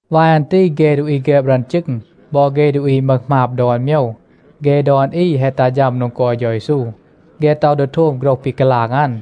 วาย อัน ตี เฆ ดูอี แฆบ รึอน จึง บอ เฆ ดูอี มึห หมาบ ดอน โมยว, เฆ ดอน อี แฮะ ตัห ฌัม โดง กอย เฌา เยซู. เฆ ต็อห ดี โทม โฆรห ปี กาลาง อัน.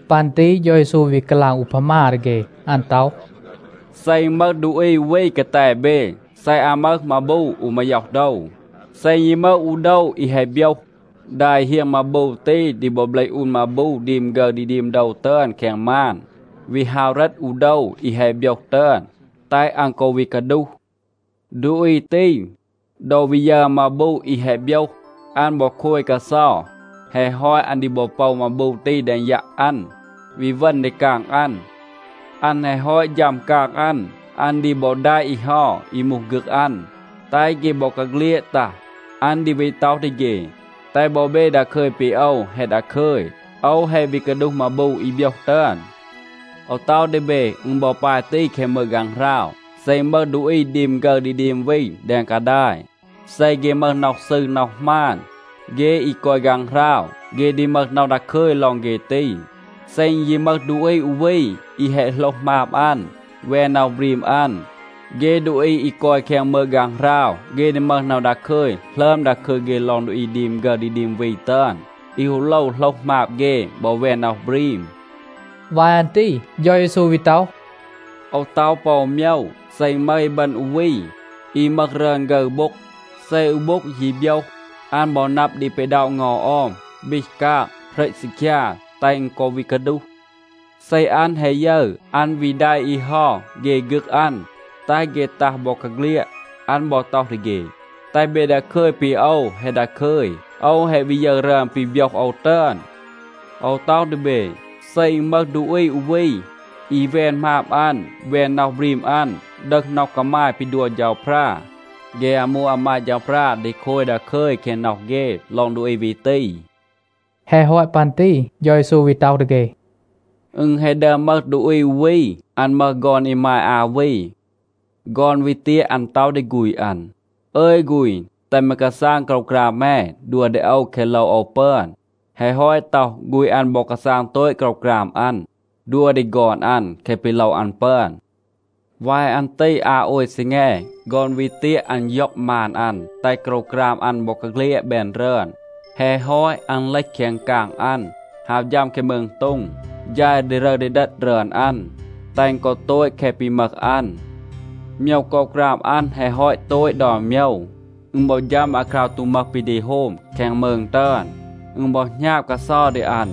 ปัน ตี เฌา เยซู วี กาลาง อูพามา ดี เฆ. อัน ต็อห, “เซ อึณ มึห ดูอี อู วี กาแต เบ, เซ อัน มึห มาบู อู มาย็อห โดว, เซ ยี มึห อู โดว อี แฮะ โบยห, ดา อี เฮียง มาบู ตี ดี บอ เบลห อูน มาบู ดีม ฆึร ดี ดีม โดว ตึอน แคง มาน, วี ฮาว เหรต อู โดว อี แฮะ โบยห ตึอน, แตห อัน กอ วี กาดูห. ดูอี ตี, ดอ วี ยึร อัน มาบู อี แฮะ โบยห, อัน บอ โคย กาเซา. แฮะ ฮอต, อัน ดี บอ โปว มาบู ตี แดง ยัะ อัน, วี เวณ ดี กาง อัน. อัน แฮะ ฮอต ฌัม กาง อัน, อัน ดี บอ แดะ อี เฮา, อี มูห ฆึก อัน, แตห เฆ บอกาเฆลียด ตัห. อัน ดี วี ต็อห ดี เฆ, ‘แตห บอ เบ ดาคึย ปี โอว แฮะ ดาคึย. โอว แฮะ วี กาดูห มาบู อี โบยห ตึอน.’ โอว ต็อห ดี เบ, อึณ บอ ปาย ตี แคง มืง ฆางหราว. เซ อึณ มึห ดูอี ดีม ฆึร ดี ดีม วี แดง กาดาย, เซ เฆ มึห น็อห ซืร, น็อห หมาน, เฆ อี กอย ฆางหราว, เฆ ดี มึห น็อห ดาคึย ลอง เฆ ตี. เซ อึณ ยี มึห ดูอี อู วี, อี แฮะ โหลห หมาบ อัน, แวน น็อห บรีม อัน, เฆ ดูอี อี กอย แคง มืง ฆางหราว, เฆ ดี มึห น็อห ดาคึย หลึอม ดาคึย เฆ ลอง ดูอี ดีม ฆึร ดี ดีม วี ตึอน, อี ฮู โลว โหลห หมาบ เฆ บอ แวน น็อห บรีม.” วาย อัน ตี เฌา เยซู วี ต็อห, “โอว ต็อห ปอ อู โมยว. เซ อึณ มึห อีบึณ อู วี, อี มึห รึอน ฆึร โบ็ง, เซ อู โบ็ง ยี โบยห, อัน บอ นับ ดี ปีด็อะ เงา ออม, บีห กาง, เหรต ซีคยา, แตห อึณ กอ วี กาดูห. เซ อัน แฮะ ยึร, อัน วี แดะ อี เฮา เฆ ฆึก อัน, แตห เฆ ตัห บอกาเฆลียด. อัน บอ ต็อห ดี เฆ, ‘แตห เบ ดาคึย ปี โอว แฮะ ดาคึย. โอว แฮะ วี ยึร รึอน ปี โบยห โอว ตึอน.’ โอว ต็อห ดี เบ. เซ อึณ มึห ดูอี อู วี, อี แวน หมาบ อัน, แวน น็อห บรีม อัน, ดึห น็อห กามาย ปี ดัว เฌาพรา, เฆ อามู อามาด เฌาพรา ดี โคย ดาคึย แคง น็อห เฆ ลอง ดูอี วี ตี.” แฮะ ฮอต ปัน ตี เฌา เยซู วี ต็อห ดี เฆ, “อึณ แฮะ ดึอม มึห ดูอี อู วี. อัน มึห ฆอน อีมาย อา วี. ฆอน วี เตียะ, อัน ต็อห ดี ฆูณ อัน, ‘อึย ฆูณ, แตห แม กาซาง โกรวกราม แม, ดัว ดี โอว แคะ โลว โอว ปึอน.’ แฮะ ฮอต ต็อห, ฆูณ อัน บอ กาซาง โตต โกรวกราม อัน, ดัว ดี ฆอน อัน แคะ ปี โลว อัน ปึอน. วาย อัน ตี อา โอย ซีแง, ฆอน วี เตียะ, อัน ย็อง มาน อัน, แตห โกรวกราม อัน บอกาเฆลียด แบน รึอน. แฮะ ฮอต, อัน เลห แคง กาง อัน, ฮาว ฌัม แคง มืง โต็ง, ฌาย ดีรึร ดีเดต รึอน อัน, แตห อึณ กอ โตต แคะ ปี มึห อัน. โมยว โกรวกราม อัน แฮะ ฮอต โตต ดอน โมยว, อึณ บอ ฌัม อาคราว ตู มึห ปี ดี โฮม แคง มืง ตึอน. อึณ บอ หณาบ กาเซา ดี อัน.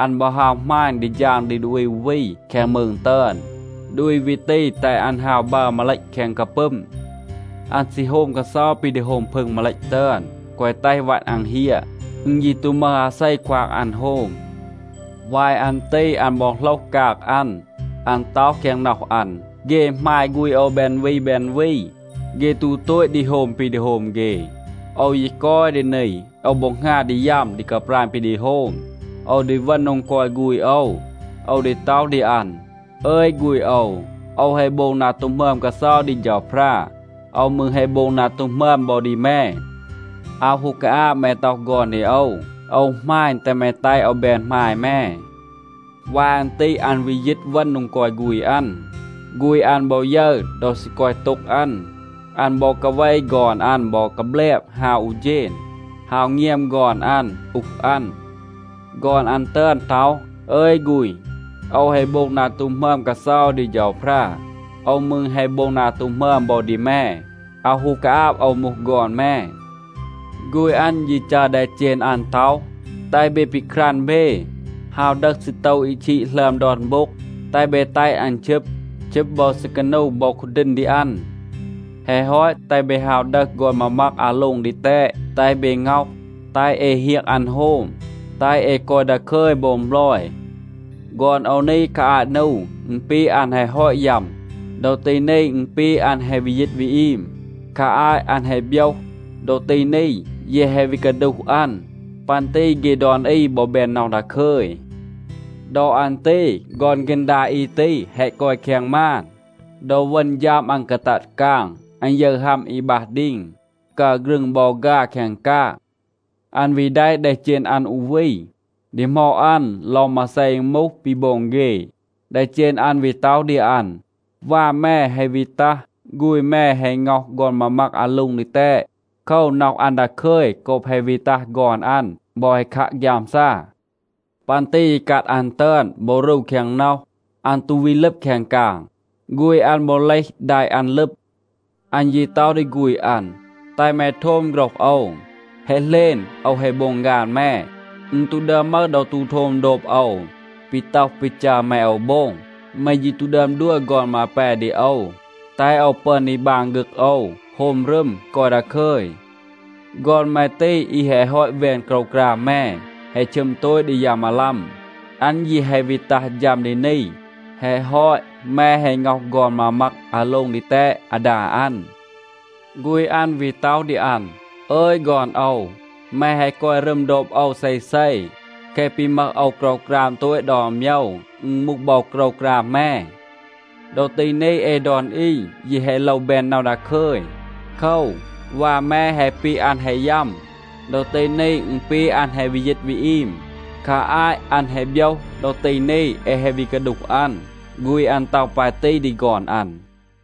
อัน บอ ฮาว หมาณ ดี ฌาง ดี ดูอี อู วี แคง มืง ตึอน. ดูอี วี ตี แตห อัน ฮาว บัร มาเลต แคง กาปึม. อัน ซี โฮม กาเซา ปี ดี โฮม พึง มาเลต ตึอน, แกวะ แตห วัต อัน เฮียะ. อึณ ยี ตู มึห อาเซ ควาง อัน โฮม. วาย อัน ตี อัน บอ โหลห กาง อัน. อัน ต็อห แคง น็อห อัน, ‘เฆ หมาย ฆูณ โอว แบน วี แบน วี, เฆ ตู โตต ดี โฮม ปี ดี โฮม เฆ. โอว ยี กอย ดี นี, โอว บอ หงา ดี ยัม ดี กาปราณ ปี ดี โฮม. โอว ดี เวณ โดง กอย ฆูณ โอว. โอว ดี ต็อห ดี อัน, “อึย ฆูณ โอว, โอว แฮะ โบง นา ตู หมึอม กาเซา ดี เฌาพรา. โอว มืร แฮะ โบง นา ตู หมึอม บอ ดี แม. อาว ฮู กาอาบ แม ต็อห ฆอน ดี โอว. โอว หมาณ, แตห แม แตห โอว แบน หมาย แม.”’ วาย อัน ตี อัน วี ยีต เวณ โดง กอย ฆูณ อัน. ฆูณ อัน บอ ยึร ดอ ซี กอย โต็ง อัน. อัน บอ กาเว ฆอน อัน บอ กาแบลบ ฮาว อู เฌณ, ฮาว เงียม ฆอน อัน, อูห อัน. ฆอน อัน ตึอน ต็อห, ‘อึย ฆูณ, โอว แฮะ โบง นา ตู หมึอม กาเซา ดี เฌาพรา. โอว มืร แฮะ โบง นา ตู หมึอม บอ ดี แม. อาว ฮู กาอาบ โอว มูห ฆอน แม.’ ฆูณ อัน ยี จัร แดเจณ อัน ต็อห, ‘แตห เบ ปีครัน เบ, ฮาว ดึห ซีโตว อี ชีด หลึอม ดอน โบ็ง, แตห เบ แตห อัน ชึบ. ชึบ บอ ซีกานู บอ คูดีณ ดี อัน. แฮะ ฮอต, แตห เบ ฮาว ดึห ฆอน มามัก อาโล็ง ดีแตด, แตห เบ ง็อห. แตห เอ เฮียง อัน โฮม. แตห เอ กอย ดาคึย โบง บลอย. ฆอน โอว นี, คา อาต นู, อึณ ปี อัน แฮะ ฮอต ยัม. ดอ ตี นี อึณ ปี อัน แฮะ วี ยีต วี อีม. คา อาต อัน แฮะ โบยห, ดอ ตี นี, เย แฮะ วี กาดูห อัน.’ ปัน ตี เฆ ดอน อี บอ แบน น็อห ดาคึย. ดอ อัน ตี ฆอน ฆีณ ดา อี ตี แฮะ กอย แคง มาน. ดอ เวณ ฌัม อัน กาตัด กาง, อัน ยึร ฮัม อี บัห ดีง, กัร ฆรึง บอ ฆา แคง กาง. อัน วี แดะ แดเจณ อัน อู วี, ดีหมอด อัน ลอง มาเซ อึณ มูห, ปี โบง เฆ. แดเจณ อัน วี ต็อห ดี อัน, ‘วา แม แฮะ วี ตัห. ฆูณ แม แฮะ ง็อห ฆอน มามัก อาโล็ง ดีแตด. โคว, น็อห อัน ดาคึย โกบ แฮะ วี ตัห ฆอน อัน บอ แฮะ คัะ ฆยามซา.’ ปัน ตี อีกัด อัน ตึอน บอ รู แคง น็อห. อัน ตู วี ลึบ แคง กาง. ฆูณ อัน บอ เลห แดะ อัน ลึบ. อัน ยี ต็อห ดี ฆูณ อัน, ‘แตห แม โทม โฆรห โอว. แฮะ เหลณ, โอว แฮะ โบง ฆาน แม. อึณ ตู ดึอม มึห ดอ ตู โทม โดบ โอว ปี ต็อห ปี จัร แม โอว โบง. แม ยี ตู ดึอม ดัว ฆอน มาแป ดี โอว, แตห โอว ปึอน ดี บาง ฆึก โอว, โฮม รึม, กอย ดาคึย. ฆอน แม ตี, อี แฮะ ฮอต แวน โกรวกราม แม, แฮะ ชึม โตต ดี ยา มาลัม, อัน ยี แฮะ วี ตัห ฌัม ดี นี, แฮะ ฮอต, แม แฮะ ง็อห ฆอน มามัก อาโล็ง ดีแตด อาดา อัน.’ ฆูณ อัน วี ต็อห ดี อัน, ‘อึย ฆอน โอว, แม แฮะ กอย รึม โดบ โอว เซเซ. แคะ ปี มึห โอว โกรวกราม โตต ดอน โมยว, อึณ มูห บอ โกรวกราม แม. ดอ ตี นี เอ ดอน อี ยี แฮะ โลว แบน น็อห ดาคึย. โคว, วา แม แฮะ ปี อัน แฮะ ยัม. ดอ ตี นี อึณ ปี อัน แฮะ วี ยีต วี อีม. คา อาต อัน แฮะ โบยห. ดอ ตี นี เอ แฮะ วี กาดูห อัน.’ ฆูณ อัน ต็อห ปาย ตี ดี ฆอน อัน.”